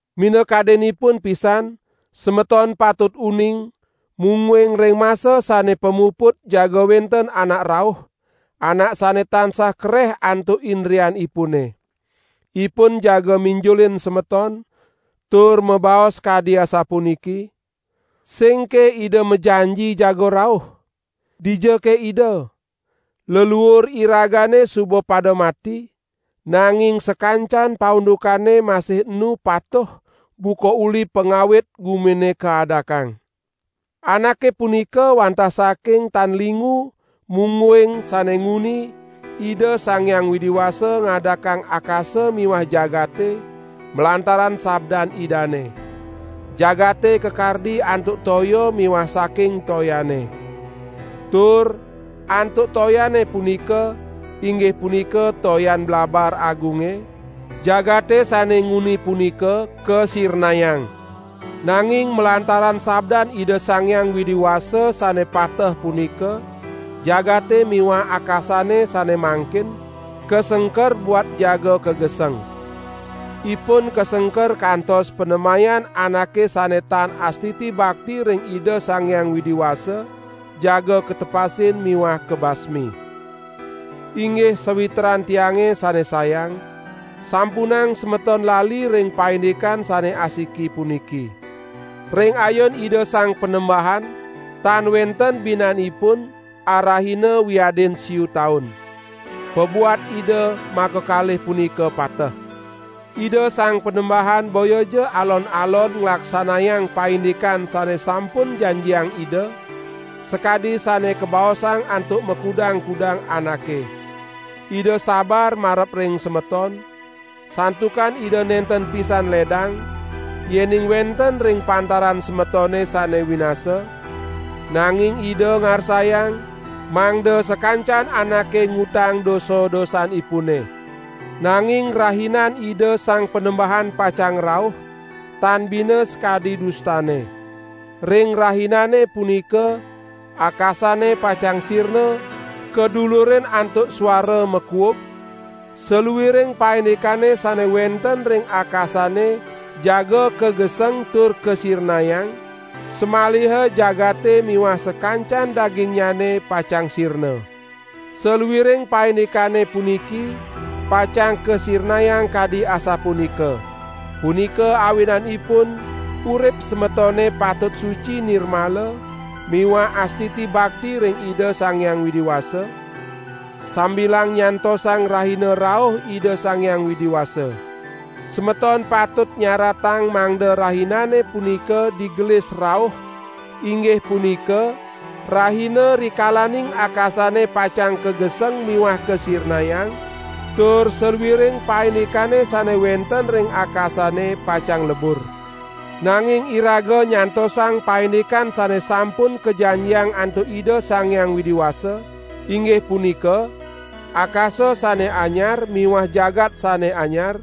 Minakadinipun pisan semeton patut uning, mungguing ring masa sane pamuput jaga wenten anak rauh, anak sane tansah kareh antuk indrianipune. Ipun jaga minjulin semeton, tur mabaos kadi asapuniki: "Singke Ida majanji jaga rauh? Dijake Ida? Leluur iragane suba pada mati, nanging sakancan paundukane masih enu patuh buka uli pangawit gumine kaadakang." Anake punika wantah saking tan lingu mungguing sane nguni Ida Sang Hyang Widi Wasa ngadakang akasa miwah jagate malantaran sabdan Idane. Jagate kakardi antuk toya miwah saking toyane. Tur antuk toyane punika, inggih punika toyan blabar agunge, jagate sane nguni punika kasirnayang. Nanging malantaran sabdan Ida Sang Hyang Widi Wasa sane pateh punika jagate miwah akasane sane mangkin, kasengker buat jaga kageseng. Ipun kasengker kantos panemayan anake sane tan astiti bakti ring Ida Sang Hyang Widi Wasa jaga katepasin miwah kabasmi. Inggih sawitran tiange sane sayang, sampunang semeton lali ring paindikan sane asiki puniki. Ring ayun Ida Sang Panembahan tan wenten binanipun arahina wiadin siu taun. Pabuat Ida makakalih punika pateh. Ida Sang Panembahan boyaja alon-alon nglaksanayang paindikan sane sampun janjiang Ida, sakadi sane kabaosang antuk makudang-kudang anake. Ida sabar marep ring semeton, santukan Ida nenten pisan ledang, yening wenten ring pantaran semetone sane winasa, nanging Ida ngarsayang mangda sakancan anake ngutang dosa-dosanipune. Nanging Rahinan Ida Sang Panembahan pacang rauh tan bina sakadi dustane. Ring Rahinane punika akasane pacang sirna kadulurin antuk suara makuug, saluiring paindikane sane wenten ring akasane jaga kageseng tur kasirnayang, samaliha jagate miwah sakancan dagingnyane pacang sirna. Saluiring paindikane puniki pacang kasirnayang kadi asapunika. Punika awinanipun urip semetone patut suci nirmala miwah astiti bakti ring Ida Sang Hyang Widi Wasa, sambilang nyantosang Rahina rauh Ida Sang Hyang Widi Wasa. Semeton patut nyaratang mangda Rahinane punika digelis rauh inggih punika Rahina rikalaning akasane pacang kageseng miwah kasirnayang, tur saluiring paindikane sane wenten ring akasane pacang lebur. Nanging iraga nyantosang paindikan sane sampun kajanjiang antuk Ida Sang Hyang Widi Wasa: inggih punika akasa sane anyar miwah jagat sane anyar,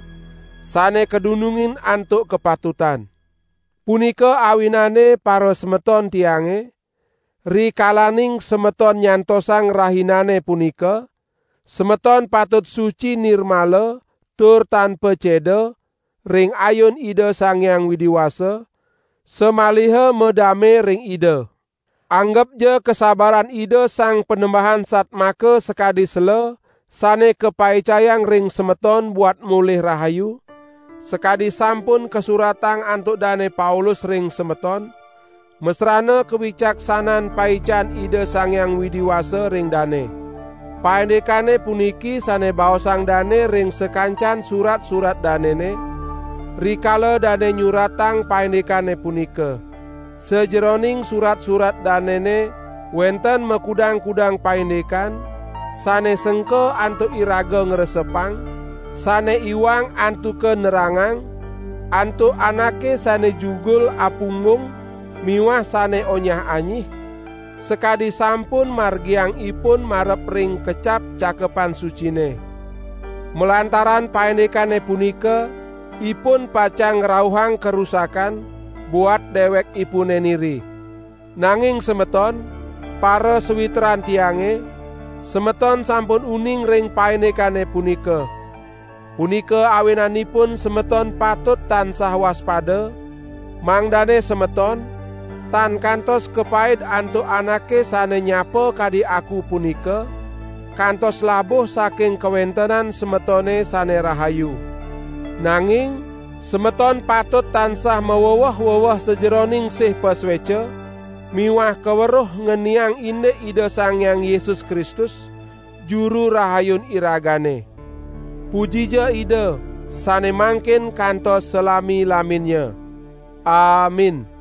sane kadunungin antuk kapatutan. Punika awinane parasemeton tiange, rikalaning semeton nyantosang Rahinane punika, semeton patut suci nirmala tur tan paceda ring ayun Ida Sang Hyang Widi Wasa, samaliha madame ring Ida. Anggepja kasabaran Ida Sang Panembahan satmaka sakadi sela sane kapaicayang ring semeton buat molih rahayu, sakadi sampun kasuratang antuk Dane Paulus ring semeton, masrana kawicaksanan paican Ida Sang Hyang Widi Wasa ring dane. Paindikane puniki sane baosang dane ring sakancan surat-surat danene, rikala dane nyuratang paindikane punika. Sajeroning surat-surat danene wenten makudang-kudang paindikan sane sengka antuk iraga ngresepang, sane iwang antuka nerangang antuk anake sane jugul apunggung miwah sane onyah-anyih, sakadi sampun margiang ipun marep ring kecap Cakepan Sucine. Malantaran paindikane punika ipun pacang ngrauhang karusakan buat dewekipune niri. Nanging semeton, parasawitran tiange, semeton sampun uning ring paindikane punika. Punika awinanipun semeton patut tansah waspada, mangdane semeton tan kantos kapaid antuk anake sane nyapa kadi aku punika, kantos labuh saking kawentenan semetone sane rahayu. Nanging semeton patut tansah maweweh-weweh sajeroning sih pasueca miwah kaweruh ngeniang indik Ida Sang Hyang Yesus Kristus, Juru Rahayun iragane. Pujija Ida sane mangkin kantos salami-laminnya. Amin.